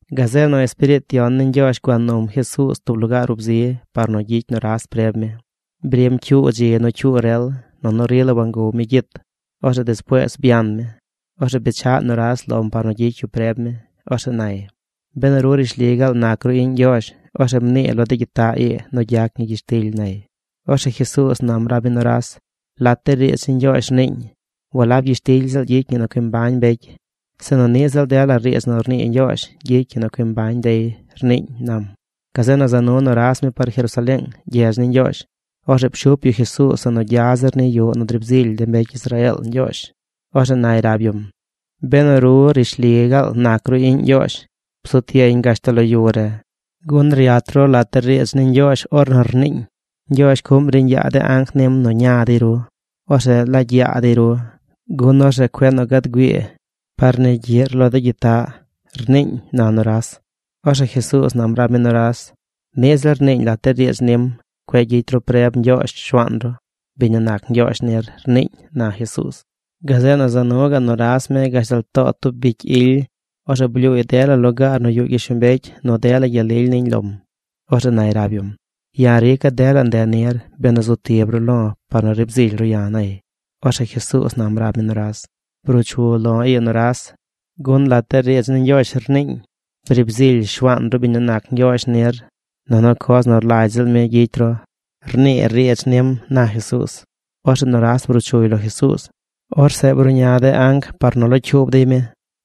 Gazeꞌ nu Espiriit Yon ni Ñgyoozh gua num Jesuuz tub lugaar ub zi par nu gyicy nuras preb mi. Brim cyuu dzi nu cyuu rel nunu rila wangow mi gyit. Orzeꞌ despuees byan mi. Orzeꞌ bechaꞌ nuras lom par nu gyicy yu preb mi. Orzeꞌ nay: ―Benu ru rishli gaal nac ru iꞌñ Ñgyoozh, orzeꞌ mnii lo de gyitaꞌ ii nu gyac ñi gyishtily ―nay. Orzeꞌ Jesuuz nam rab mi nuras: ―Lat de riidz ni Ñgyoozh rniiñ: “Walab gyishtily ziꞌl gyicy ñi nu cui mbañ mbecy, sinu niꞌ ziꞌl dela riidz nu rnii Ñgyoozh gyicy ñi nu cui mbañ dey”, rniiñ ―nam. Gazeꞌ nu za nu nuras mi par Jerusaleeng, gyedz ni Ñgyoozh. Orzeꞌ pshup yu Jesuuz zeꞌ nu gya zir ni yuꞌ nu driib zily de mbecy Israeel Ñgyoozh. Orzeꞌ nay rab yum: ―Benu ru rishli gaal nac ru iꞌñ Ñgyoozh, bzut yeñ gashtal lo yu re, gun ryat ru lat de riidz ni Ñgyoozh ornu rniiñ: Ñgyoozh cuꞌm riiñ yaa de anc nim nu ña dey ru. Orzeꞌ laagy yaa dey ru gun orzeꞌ cueꞌ nu gad güii par ni gyiꞌr lo de gyitaꞌ, rniiñ ―na nuras. Orzeꞌ Jesuuz nam rab mi nuras: ―Niꞌ ziꞌl rniiñ lat de riidz nim: “Cueꞌ gyicy ru preb Ñgyoozh Shuaan ru, biñ nu nac Ñgyoozh nir”, rniiñ ―na Jesuuz. Gazeꞌ nu za nu gaꞌ nuras mi gashtal too tub bicy ily. Orzeꞌ blyuuy dela lugaar nu yuꞌ gyishlombecy nu dela gyel lily niñ lom. Orzeꞌ nay rab yum: ―Ya̱ rica̱ dela nde nir benu zu tib ru lo̱ par nu riib zily ru ya̱ ―nay. Orzeꞌ Jesuuz nam rab mi nuras. ―Bruu chu lo̱ ii nuras, gun lat de riidz ni Ñgyoozh rniiñ: “Briib zily Shuaan ru biñ nu nac Ñgyoozh nir, nunu coz nu rlagy ziꞌl mi gyicy ru”, rnii riidz nim ―na Jesuuz. Orzeꞌ nuras bruu chuy lo Jesuuz. Orzeꞌ bruꞌña de anc par nu locyuub dey mi.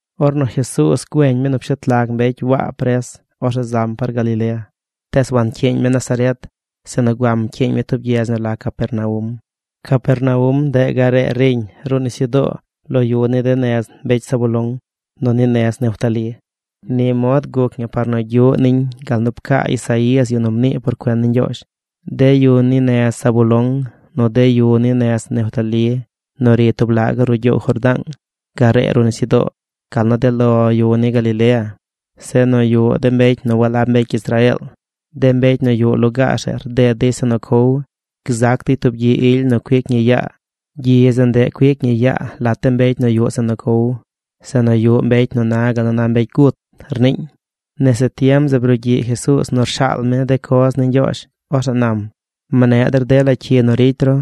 Ornu Jesuuz güeñ mi nu pshet lag mbecy Waa pres, orzeꞌ zam par Galilea. Tees wancyiiñ mi Nazaret sinu guam pcyiiñ mi tub gyedz nu la Capernaum. Capernaum ndeꞌ garee riñ ruꞌ nisyudoo lo yu ni de nez mbecy Zabulón nu ni nez Neftalí. Ni mod guc ñi par nu gyuꞌ niñ gal nu pcaa Isaías, yu nu mnii por cuen ni Ñgyoozh: De yu ni nez Zabulón nu de yu ni nez Neftalí nu ri tub la gaꞌ ruꞌ gyoow Jordaang garee ruꞌ nisyudoo, gal nu de lo yu ni Galilea, zeꞌ nu yuꞌ mbecy nu walab mbecy Israeel, de mbecy nu yuꞌ lugaar zeꞌ rded dey zeꞌ nu cow. Gzac dey tub gyi ily nu cuic ñi yaa. Gyi zeꞌ ndeꞌ cuic ñi yaa lat de mbecy nu yuꞌ zeꞌ nu cow, zeꞌ nu yuꞌ mbecy nu na gal nu na mbecy gut, rniiñ. Nese tiem zeꞌ brugyiꞌ Jesuuz nu rshaal mi de coz ni Ñgyoozh. Orzeꞌ nam: ―Mneꞌ der dela cyi nu ricy ru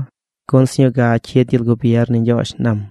gun sñuu ga cyid gyel gubier ni Ñgyoozh ―nam.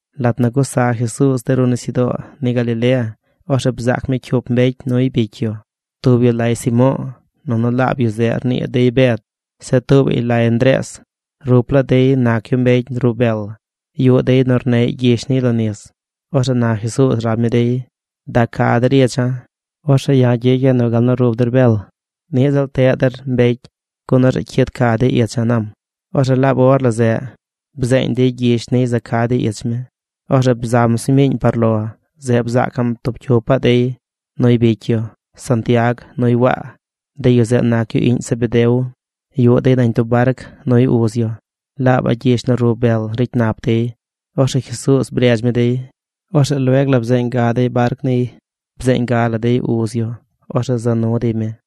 Lat nu gusa Jesuuz de ruꞌ nisyudoo ni Galilea, orzeꞌ bzaac mi cyup mbecy nuy bicy yu. Tub yu lay Simo̱o̱, nunu laab yu zeꞌ rnii dey Bed. Zeꞌ tuubaꞌy lay Ndrees. Rup laa dey nac yu mbecy rub bel. Yuꞌ dey nu rneꞌy gyish niy lo nis. Orzeꞌ na Jesuuz rab mi dey: ―Da ca der icha̱. Orzeꞌ ya̱ gyicya̱ nu gal nu rub der bel, niꞌ ziꞌl teꞌ der mbecy gun orzeꞌ cyid ca dey icha̱ ―nam. Orzeꞌ laab or la zeꞌ bzeeñ dey gyish niy za ca dey ich mi. Orzeꞌ bzam sñuu miiñ par lo. Zeꞌ bzaacaꞌm tub cyupaꞌ dey nuy bicy yu: Santiag nuy Waa. De yu zeꞌ nac yu iꞌñ Zebedeo. Yuꞌ dey nañ tub barc nuy uz yu. Laabaꞌ gyish nu rub bel ricy nap dey. Orzeꞌ Jesuuz bredz mi dey. Orzeꞌ lueg la bzeeñ ga dey barc niy. Bzeeñ ga la dey uz yu. Orzeꞌ za nu dey mi.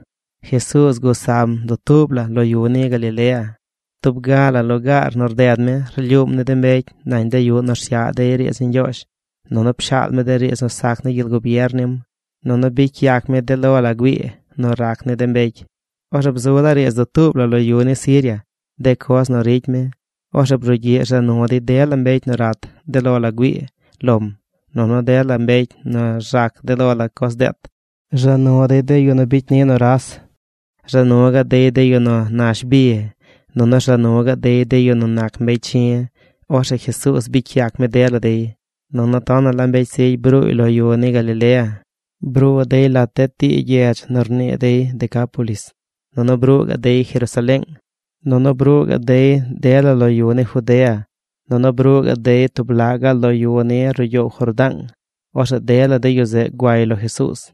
Jesuuz gusam dutuub la lo yu ni Galilea. Tub ga la lugaar nu rded mi, rlyuum ni de mbecy nañ de yuꞌ nu rsyaꞌ dey riidz ni Ñgyoozh, nunu pshaal mi de riidz nu sac ni gyel gubier nim, nunu bicy yac mi de lo la güii nu rac ni de mbecy. Orzeꞌ bzu laa riidz dutuub la lo yu ni Siria de coz nu ricy mi. Orzeꞌ brugyiꞌ rza nu dey dela mbecy nu rat de lo la güii lom, nu dela mbecy nu rzac de lo la coz deet. Rza nu dey de yu nu bicy ni nuras. Rza nu gaꞌ dey de yu nu nash bi. Nunu rza nu gaꞌ dey de yu nu nac mbecy chi̱. Orzeꞌ Jesuuz bicy yac mi dela dey. Nunu tonaꞌ la mbecy zigy bruuy lo yu ni Galilea, bruu dey lat de tii gyedz nu rnii dey Decápolis, nunu bruu gaꞌ dey Jerusaleeng, nunu bruu gaꞌ dey de la lo yu ni Judea, nunu bruu gaꞌ dey tub laꞌ gaꞌ lo yu ni ruꞌ gyoow Jordaang. Orzeꞌ dela de yu zeꞌ guay lo Jesuuz.